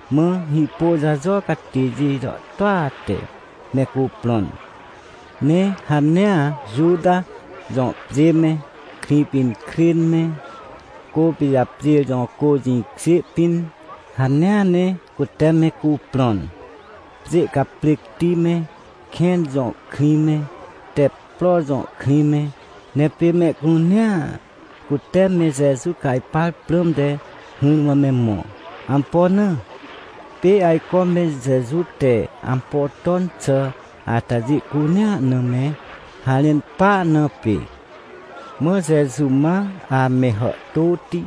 Mã Hĩpôjajo catêjê jàhtôa te me cuprõn. Ne hanea Juta jõ pjê me, Krĩpinkrên me, Côpijapjêr jõ cô jĩkjê pĩn hanea ne cute me cuprõn, Pjêhcaprêcti me, Kẽn jõ krĩ me, Teppro jõ krĩ me. Ne pê mehcunea, cute me Jeju cajpar prãmte, hỹrmã me mõ. Ampo na? Pê ajco me Jeju te ampo ton xà atajê cunea na me harẽn pa na pê. Mã Jeju ma ame hàhtôti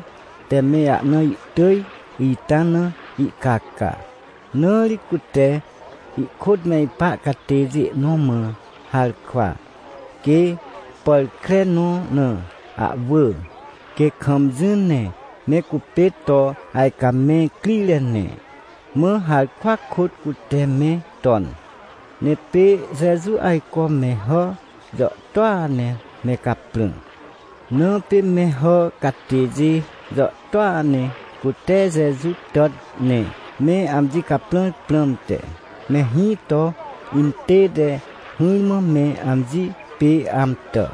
te me ahna ihtỳj ita na ihcaca, na ri cute ihkôt me ipa catêjê nõ mã harkwa, quê pàr kre nõ na ahwỳ, quê kam jỹ ne me cupê to ajcamẽ crire ne. Mã harkwa kôt cute me ton. Ne pê Jeju ajco me hà jàhtôa ne me caprã. Na pê me hà catêjê jàhtôa ne cute Jeju tàt ne me amji caprãr prãmte, me hĩ to intête hỹrmã me amji pê amtà.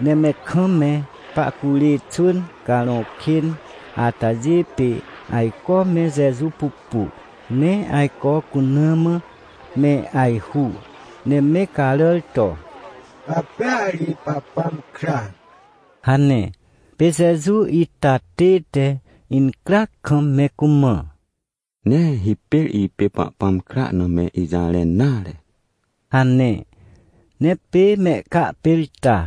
Ne me kam me pahcurê xwỳn carõ kên atajê pê ajco me Jeju pupu, ne ajco cuna mã me ajhu, ne me caràr to: — Apêa ri Pahpãm kra — hane. Pê Jeju ita tête incryac kam me cumã: — Nee hipêr ipê Pahpãm kra na me ijarẽn nare — hane. Ne pê mehcahpêrta.